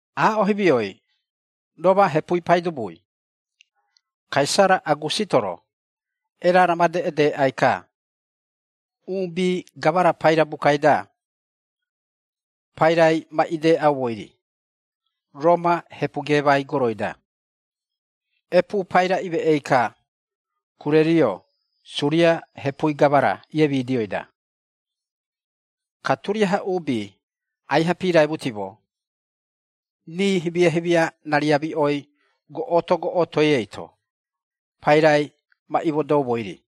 Aaꞌo himioi, Roma hepui paidubui, Kaisara Agusito-ro, erara made edeꞌai-ka, uubi gamara paira bukai-da, pairai ma ideꞌaumoi-ri, Roma hepu geemai goroi-da. Epuu paira imeꞌei-ka, Kurerio Suria hepui gamara iiemidioi-da. Ka turiaha uubi aiha piiraimutimo, rii himia-himia rariamiꞌoi, goꞌoto-goꞌotoi eito, pairai ma imodoumoi-ri.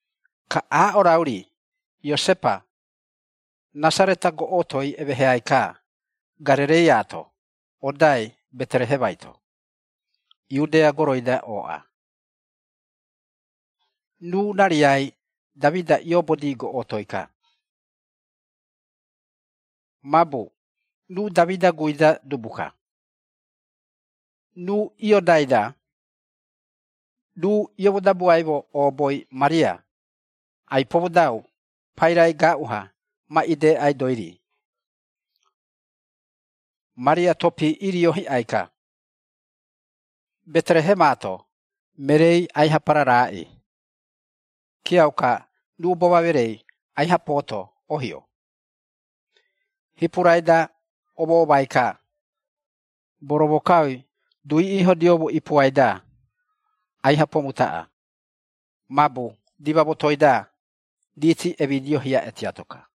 Ka aaꞌo rau-ri Iosepa, Rasareta goꞌotoi emeheai-ka Garereiaato, odai Beterehemai-to, Iudea goroi-da ooꞌa. Ruu rariai Damida ioobodi goꞌotoi-ka. Mabu ruu Damida guui-da dubu-ka. Ruu iodai-da, ruu iomodabuaimo ooboi Maria, ai-pomodau pairai gaaꞌu-ha ma ideꞌaidoi-ri. Maria topii irio hiꞌai-ka. Beterehemaa-to, mereei aiha pararaꞌii, kiauka, ruu boma mereei aiha pooto ohio, hipurai-da omoomai-ka, boromokaui duui iihodioumo ipuai-da, aiha pomutaꞌa. Mabu dima motoi-da, riiti emidio hiaꞌe tiato-ka.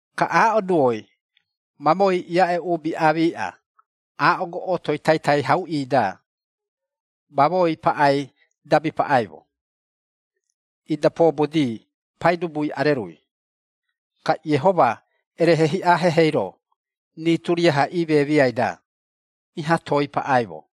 Ka aaꞌo duoi, mamoei iaꞌe uubi aamiꞌa, aaꞌo goꞌotoi taitai hauꞌii-da, mamoei paꞌai dabi paꞌaimo. Ida poobodi Paidubui Arerui, ka Iehoma erehe hiꞌa hehei-ro, rii turiaha imemiai-da, iha toei paꞌaimo.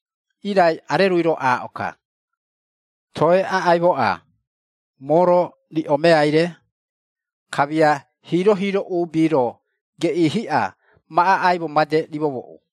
Irai Arerui-ro aaꞌo-ka, “Toe aꞌaimoꞌa, moo-ro riꞌo meai-re, kamia hiiro-hiiro uubi-ro geꞌii hiꞌa, ma aꞌaimo made rimomoꞌu.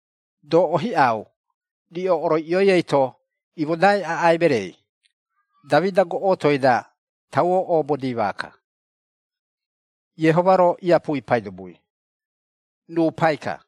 Doꞌo hiꞌau riꞌo oroiꞌioi eito imodai aꞌai mereei, Damida goꞌotoi-da tauo oobodi maaka, Iehoma-ro Iapui Paidubui, ruu Pai-ka.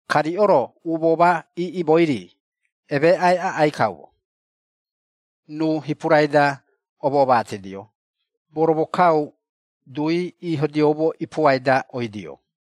Ka riꞌo-ro umoo ma iiꞌimoi-ri emeeꞌai aꞌai kaumo, ruu hipurai-da omoomatidio, boromokau duu_i iihodioumo ipuai-da oidio.”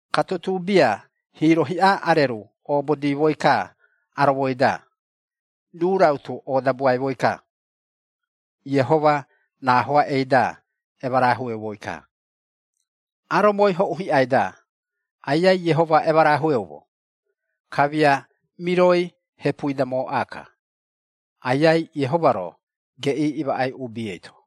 Ka tutuu bia hiiro hiꞌa areru oobodimoi-ka aromoi-da, ruu rautu oodabuaimoi-ka, Iehoma raahoaꞌei-da emarahueumoi-ka, “Aromoi hoꞌu hiꞌai-da, Aiai Iehoma emarahueumo, kamia miroi hepui-da mooꞌa-ka, Aiai Iehoma-ro geꞌii imaꞌai uubi eito!”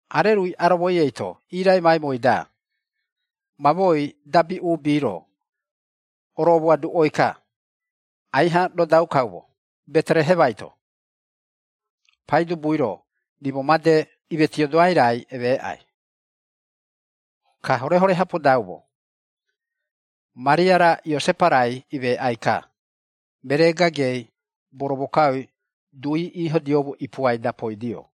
Arerui aromoi eito iraimaimoi-da, mamoei dabi uubi-ro, oromoaduꞌoi-ka, “Aiha rodau kaumo, Beterehemai-to, Paidubui-ro rimo made, imetiodoai raai emeeꞌai.” Ka horehore-ha podaumo, Maria-ra Iosepa-rai imeꞌai-ka, meree gagei boromokaui duui iihodioumo ipuai-da poidio.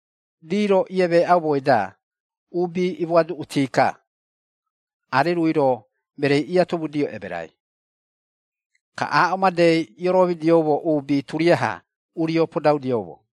Rii-ro iemeeꞌaumoi-da uubi imoaduꞌuti-ka, arerui-ro mereei iatomudio emerai. Ka aaꞌo madei ioromidioumo uubi turiaha urio podaudioumo.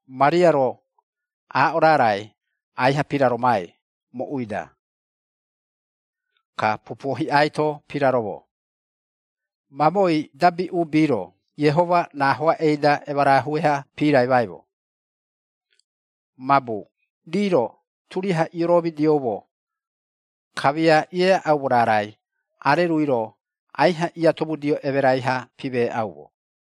Maria-ro aaꞌo raarai aiha piraromai moꞌui-da, ka pupuo hiꞌai-to piraromo. Mamoei dabi uubi-ro Iehoma raahoaꞌei-da emarahue-ha piraimaimo. Mabu rii-ro turiaha ioromidioumo, kamia ieaꞌaumo raarai arerui-ro aiha iatomudio emerai-ha pimeeꞌaumo.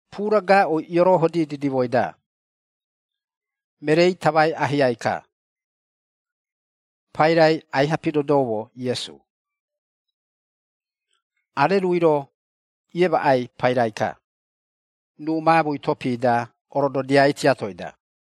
Puura gaaꞌui iorohodi didimoi-da, mereei tamai ahiai-ka, pairai aiha pidodoumo Iesu. Arerui-ro iemaꞌai pairai-ka, ruu maamui topi-da orododiai tiatoi-da.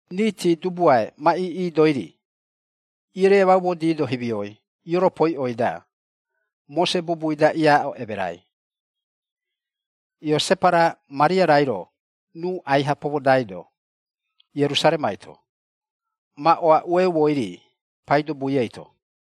Riiti dubuae ma iiꞌidoi-ri, ieremaumodido himioi ioropoiꞌoi-da, Mose bubui-da iaaꞌo emerai, Iosepa-ra Maria-rairo ruu aiha pomodaido, Ierusaremai-to, ma oaꞌueumoi-ri Paidubui eito.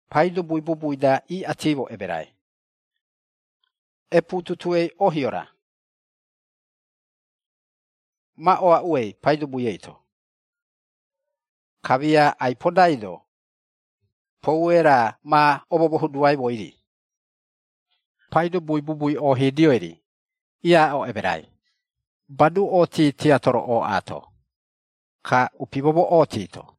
Paidubui bubui-da iꞌatimo emerai, “Epuu tutuei ohio-ra, ma oaꞌuei Paidubui eito”. Kamia ai-podaido, poue raa ma omomohuduaimoi-ri, Paidubui bubui ohidioi-ri, iaaꞌo emerai, badu-oti tiato-ro ooꞌaato, ka upi momoꞌooti-to.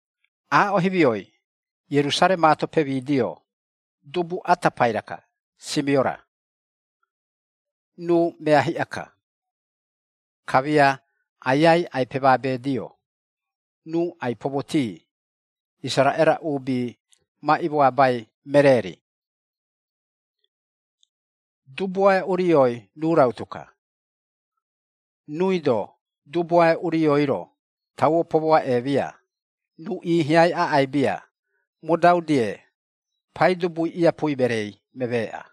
Aaꞌo himioi Ierusaremaa-to pemidio dubu ata paira-ka Simiora, ruu mea hiꞌa-ka. Kamia Aiai ai-pemabeedio, ruu ai-pomoti Isaraꞌera uubi ma imoabai meree-ri. Dubuae Urioi ruu rautu-ka, ruui-do Dubuae Urioi-ro, tauo pomoaꞌeemia, ruu iihiai aꞌai bia, modau-die Paidubui iapui mereei memeeꞌa.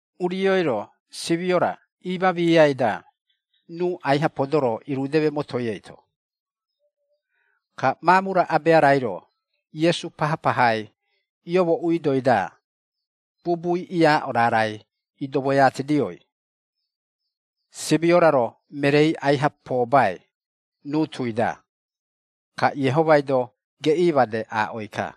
Urioi-ro Simiora iimaamiai-da, ruu aiha podoro irudeme motoi eito. Ka maamu-ra abea-rairo Iesu pahapahai iomooꞌuidoi-da, bubui iaaꞌo raarai idomoiatidioi, Simiora-ro mereei aiha poobai ruu tui-da, ka Iehomai-do geꞌii made aaꞌoi-ka,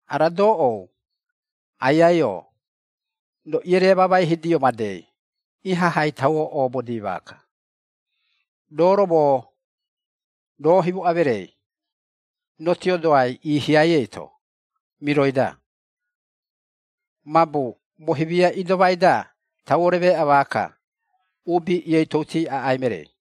“Ara doꞌou, Aiai-o, roo ieremamaihidio madei ihahai tauo oobodi maaka, roo-ro moo, roo himoꞌa mereei, rotiodoai iihiai eito, miroi-da. Mabu moo himia idomai-da tauo remeeꞌa maaka, uubi ioitouti aꞌai mereei.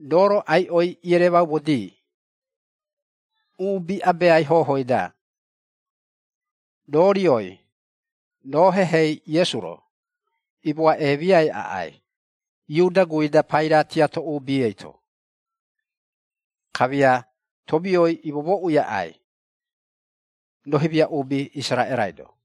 Roo-ro aiꞌoi eremaumodi, uubi abeai hohooi-da, roo rioi, roo hehei Iesu-ro, imoaꞌemiai aꞌai, Iuda guui-da paira tiato uubi eito, kamia tomioi imomoꞌui aꞌai, roo himia uubi Isaraꞌerai-do.”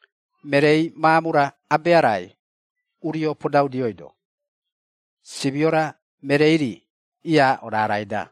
Mereei maamu-ra abea-rai urio podaudioido, Simiora mereei-ri iaaꞌo raarai-da.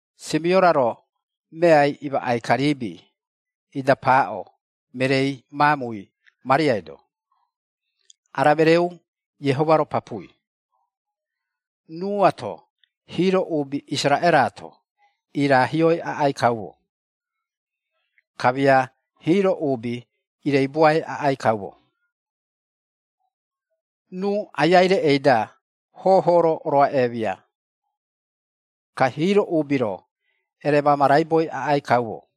Simiora-ro meai imaꞌai-ka riibi, ida paaꞌo mereei maamui Mariai-do, “Ara mereeꞌu Iehoma-ro papui, ruuato hiiro uubi Isaraꞌera-to iraahioi aꞌai kaumo, kamia hiiro uubi ireibuai aꞌai kaumo. Ruu Aiai reꞌei-da hooho-ro oroaꞌeemia, ka hiiro uubi-ro eremamaraiboi aꞌai kaumo,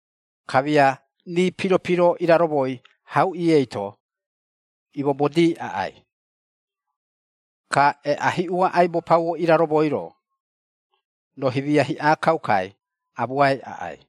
kamia rii piro-piro iraromoi hauꞌi eito imobodii aꞌai. Ka eꞌa hiꞌua aibo pauo iraromoi-ro, roo himia hiꞌa kaukai amuai aꞌai.”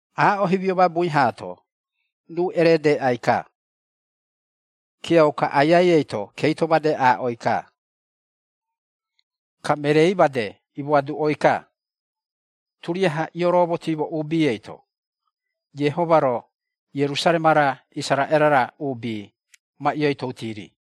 Aaꞌo himio mabui haato, ruu eredeꞌai-ka, kiauka Aiai eito keito made aaꞌoi-ka, ka mereei made imoaduꞌoi-ka turiaha goꞌoto-goꞌotoi ioroomotiimo uubi eito, Iehoma-ro Ierusarema-ra Isaraꞌera-ra uubi, ma ioitouti-ri.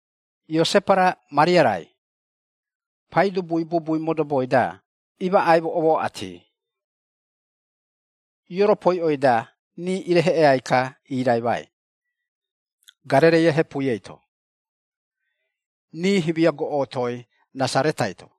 Iosepa-ra Maria-rai, Paidubui Bubui modoboi-da imaꞌaimo omaꞌati, ioropoiꞌoi-da rii ireheꞌeai-ka iiraimai, Garereia hepui eito, rii himia goꞌotoi Rasaretai-to.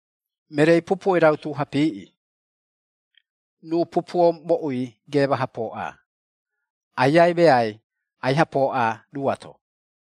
Mereei pupuoi rautu-ha piiꞌi, ruu pupuo moꞌui geema-ha pooꞌa. Aiai meai, aiha pooꞌa ruuato.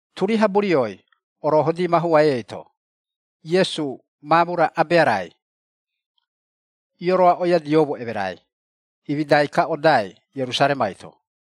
Turiaha burioi Orohodi mahuai eito, Iesu maamu-ra abea-rai ioroaꞌoiadioumo emerai, imidai-ka odai Ierusaremai-to.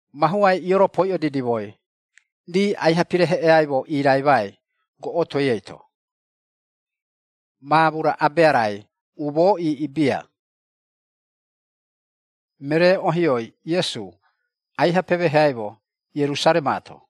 Mahuai ioropoiꞌo didimoi, rii aiha pireheꞌeaimo iraimai goꞌotoi eito, maamu-ra abea-rai umoo iiꞌi bia, meree ohioi Iesu aiha pemeheaimo Ierusaremaato.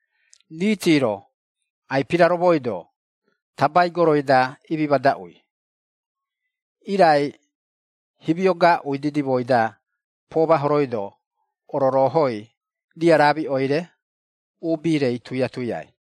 Riiti-ro ai-piraromoido tabai goroi-da imimadaꞌui, irai himio gaaꞌui didimoi-da pomahoroido ororoohoi riaraamiꞌoi-re uubi-rei tuia-tuiai.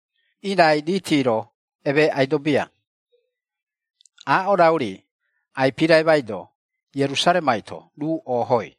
Irai riiti-ro emeeꞌaido bia. Aaꞌo rau-ri, ai-piraimaido Ierusaremai-to ruu oohoi.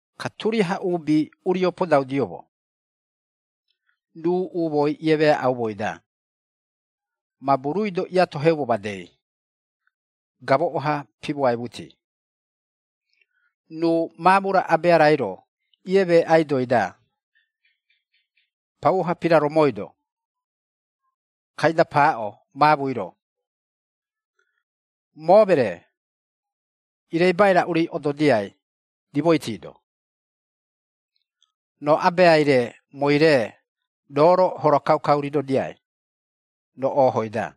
Ka turiaha uubi urio podaudioumo, ruu umooi iemeaꞌaumoi-da, mabu ruui-do iatoheumo madei, gamoꞌo-ha pimoaimuti. Ruu maamu-ra abea-rairo iemeeꞌaidoi-da, pauo-ha piraromoido, kaida paaꞌo maamui-ro, “Moo meree, ireibai raꞌu-ri ododiai rimoiti-do? Roo abeai-re mooi-re, roo-ro hora kaukau ridodiai, roo oohoi-da.”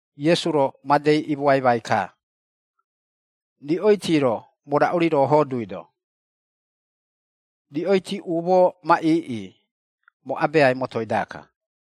Iesu-ro madei imoaimai-ka, “Riꞌoiti-ro moo raꞌu-ri rooho duido, riꞌoiti umoo ma iiꞌi, moo abeai motoi-daka.”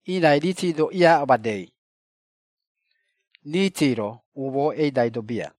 Irai riiti-do iaaꞌo madei, riiti-ro umoo eidaido bia.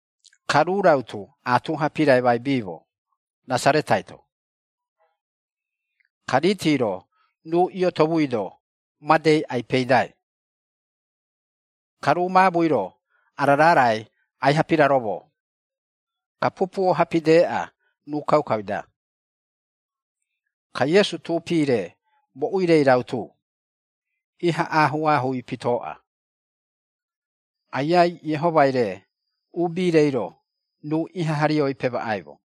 Ka ruu rautu atuha piraimaibiimo Rasaretai-to. Ka riiti-ro ruu iotomuido madei ai-peidai. Ka ruu maamui-ro ara raarai aiha piraromo, ka pupuo-ha pideꞌa ruu kaukai-da. Ka Iesu tuupi-re moꞌui-rei rautu, iha aahuu-aahuui pitoꞌa, Aiai Iehomai-re uubi-reiro ruu ihaha rioi pemaꞌaimo.